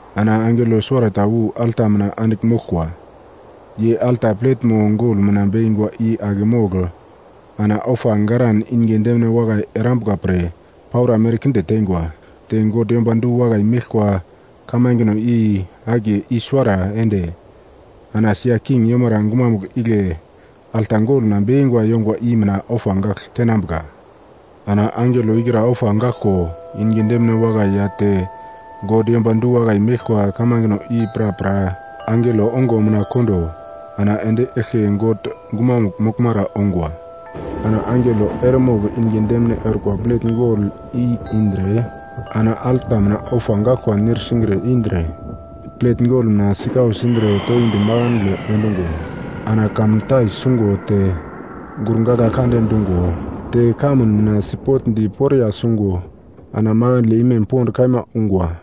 Ana angelo suwarata wu alta mina andigl moglkwa. Ye alta pletmo gol mina bekingwa i ake mogl ana ofa garan inge demine wakai erambuka pre paura merkinde teingwa, te God yomba du-wakai meglkwa kamangeno i akiye i-suwara ende ana sia king yomara gumamugl igle alta gol mina bekingwa yongwa i mina ofa gagl tenambuka. Ana angelo ikra ofa gaglko inge demine wakai ya te God yomba du-wakai meglkwa kamangeno i prapra angelo ongo mina kondo ana endi eglke God gumamugl moglmara ongwa. Ana angelo eremogl inge demine orkwa plet gol i indre ana alta mina ofa gaglkwa nir singre indre plet gol mina sikau sindre toindi makandle endungo ana kamuntai sungo te gurgagla kande dungo te kamun mina sipotndi poriya sungo ana makandle imem pond kaima ungwa.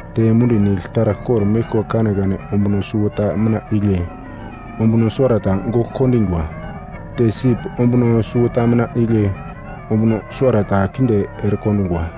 Te mundi nigl taragl kor-meglkwa kanekane ombuno suwota mina igle ombuno suwarata gogl kondingwa. Te sip ombuno suwota mina igle ombuno suwarata kinde erekondungwa.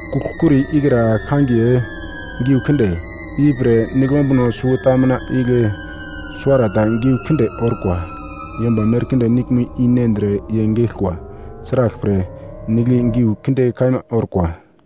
Kugl-kuri ikra kangiye, “Geu kinde”. Ipre nigl ombuno suwota mina igle suwarata giu kinde orkwa. Yomba merkinde niglmo i nendre ye geglkwa. Sraglpre, nigl i giu kinde kaima orkwa.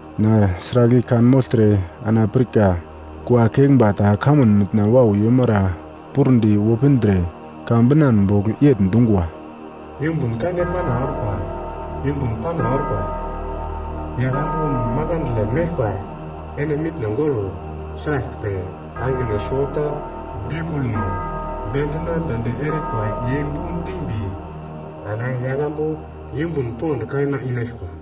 Na sragl i kanmogltre ana pirka kua keglmba ta kamun mitna wau yomara pur-di wopindre ka binan bogl yegl dungwa, “Yumbun kande pana orkwa, yumbun pana orkwa! Yaglambu makandle meglkwa ene mitno golo. Sraglpre, angelo suwota biukulno bendinamnedi erikwa ye bu dimbi ana yaglambu yumbun pond kaima inaglkwa!”